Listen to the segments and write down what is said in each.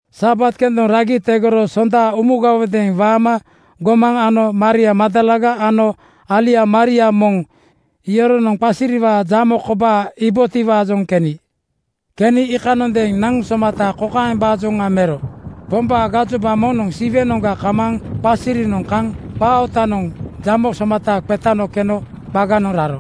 Sabat kendoŋ ragi tegoro Sonda umugawodeeŋ waama gomaŋ ano Maria Magdalaga ano alia Maria moŋ yoronoŋ qasiriwaa jamo kobaa iibotiwaajoŋ keni. Keni iikanondeeŋ naŋ somata kokaembaajoŋa mero: Pombaa gajoba moŋnoŋ Siwenoŋga kamaaŋ qasirinoŋ kaŋ qaa ootanoŋ jamo somata qetano keno qaganoŋ raro.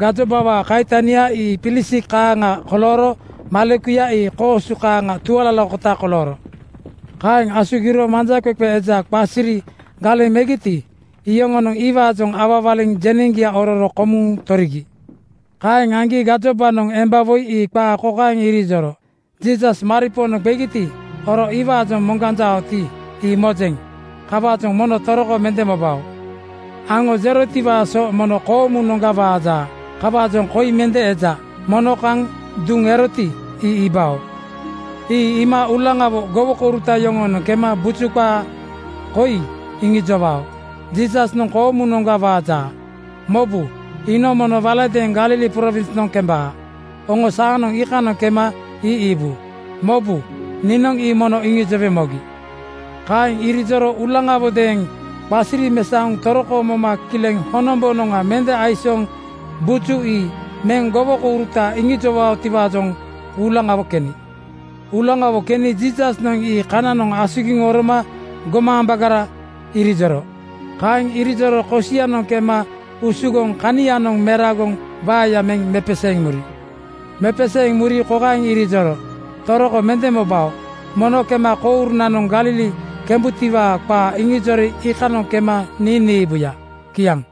Gajobawaa kaitania ii pilisik kaaŋa kolooro malekuya ii koosu kaaŋa tualalakota kolooro. Kaeŋ asugiro manjaqeqe eja qasiri galeŋ megiti, iyoŋonoŋ iwaajoŋ awawaliŋ jeneŋgia ororo komuŋ torigi. Kaeŋ aŋgi gajobanoŋ emba woi ii qaa kokaeŋ irijoro, “Jiisas maripoonoŋ qegiti, oro iwaajoŋ moŋganjaoti, ii mojeŋ. Kawaajoŋ mono toroko mende mobao. Aŋo jerotiwaa so mono koomunoŋga waaja. Kawaajoŋ koi mende eja. Mono kaŋ duŋ eroti, ii iibao. Ii iima uulaŋawo gowokouruta yoŋoonoŋ kema buju qaa koi iŋijowao, Jiisasnoŋ koomunoŋga waaja. Mobu, iinoŋ mono waladeeŋ Galili prowinsnoŋ kembaa. Oŋo saanoŋ iikanoŋ kema ii iibu. Mobu, niinoŋ ii mono iŋijowe mogi.” Kaeŋ irijoro uulaŋawodeeŋ qasiri mesaoŋ toroko moma kileŋ honombonoŋa mende aisooŋ buju ii meŋ gowokouruta iŋijowaotiwaajoŋ uulaŋawo keni. Uulaŋawo keni Jiisasnoŋ ii kananoŋ asugiŋ oroma “Gomaambagara!” irijoro. Kaeŋ irijoro kosianoŋ kema usugoŋ kanianoŋ meragoŋ waeya meŋ mepeseeŋ muri. Mepeseeŋ muri kokaeŋ irijoro, “Toroko mende mobao. Mono kema kourunanoŋ Galili kembutiwaa qaa iŋijori iikanoŋ kema nii niibuya.” Kiaŋ.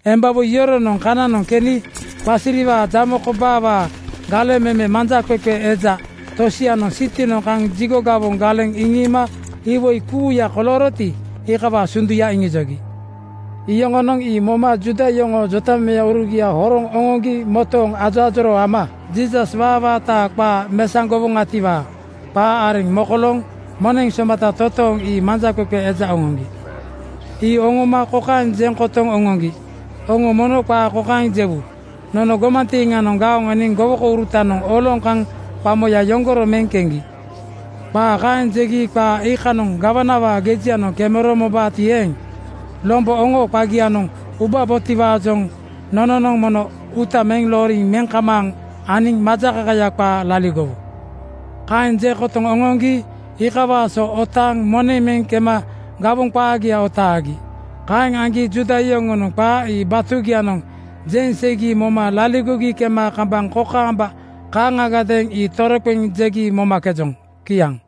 Embawoi yoronoŋ kana keni qasiriwaa jamo kobaawaa galeŋ meme manjaqeqe eja tosianoŋ sitinoŋ kaŋ jigo gawoŋ galeŋ iŋiima iwoi kuuya kolooroti, iikawaa sunduya iŋijogi. Yoŋonoŋ ii moma Juuda yoŋoo jotamemeurugia horoŋ oŋoŋgi motooŋ ajoajoroo ama Jiisas waawaataa qaa mesaŋgowoŋatiwaa qaa areŋ mokolooŋ moneŋ somata totooŋ ii manjaqeqe eja oŋoŋgi. Ii oŋoma kokaeŋ jeŋ kotoŋ oŋoŋgi, “Oŋo mono qaa kokaeŋ jewu: Nono gomantiiŋanoŋ gaoŋ eniŋ gowokourutanoŋ oloŋ kaŋ qamoya yoŋgoro meŋ keŋgi. Qaa kaeŋ jegi qaa iikanoŋ gawanawaa gejianoŋ kemero mobaati eeŋ, lombo oŋoo qagianoŋ ubabotiwaajoŋ nononoŋ mono uuta meŋ looriŋ meŋ kamaaŋ aniŋ majakakaya qaa laligowu.” Kaeŋ jeŋ kotoŋ oŋoŋgi iikawaa so otaaŋ moneŋ meŋ kema gawoŋ qaagia otaagi. Kaeŋ aŋgi Juuda yoŋonoŋ qaa ii batugianoŋ jeŋ seigi moma laligogi kema kambaŋ kokaamba kaaŋagadeeŋ ii toroqeŋ jegi momakejoŋ. Kiaŋ.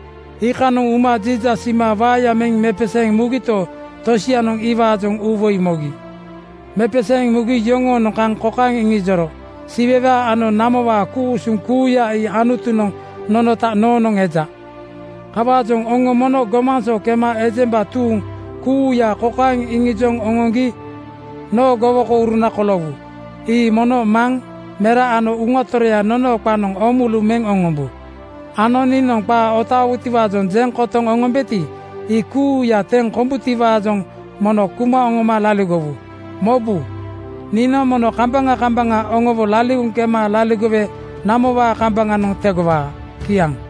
Iikanoŋ uma Jiisas iima waeya meŋ mepeseeŋ mugito, tosianoŋ iwaajoŋ uuwoi mogi. Mepeseeŋ mugi yoŋoonoŋ kaŋ kokaeŋ iŋijoro, “Siwewaa ano namowaa ku-usuŋ kuuya ii Anutunoŋ nonota noonoŋ eja. Kawaajoŋ oŋo mono gomaŋ so kema ejemba tuuŋ kuuya kokaeŋ iŋijoŋ oŋoŋgi noo gowokouruna koloowu: Ii mono Maŋ, Mera ano Uŋa Toroya nonoo qanoŋ oomulu meŋ oŋombu ano niinoŋ qaa otaawutiwaajoŋ jeŋ kotoŋ oŋombeti, ii kuuya teŋ kombutiwaajoŋ mono kuma oŋoma laligowu. Mobu, niinoŋ mono kambaŋa kambaŋa oŋowo laligoŋ kema laligowe namowaa kambaŋanoŋ tegowaa.” Kiaŋ.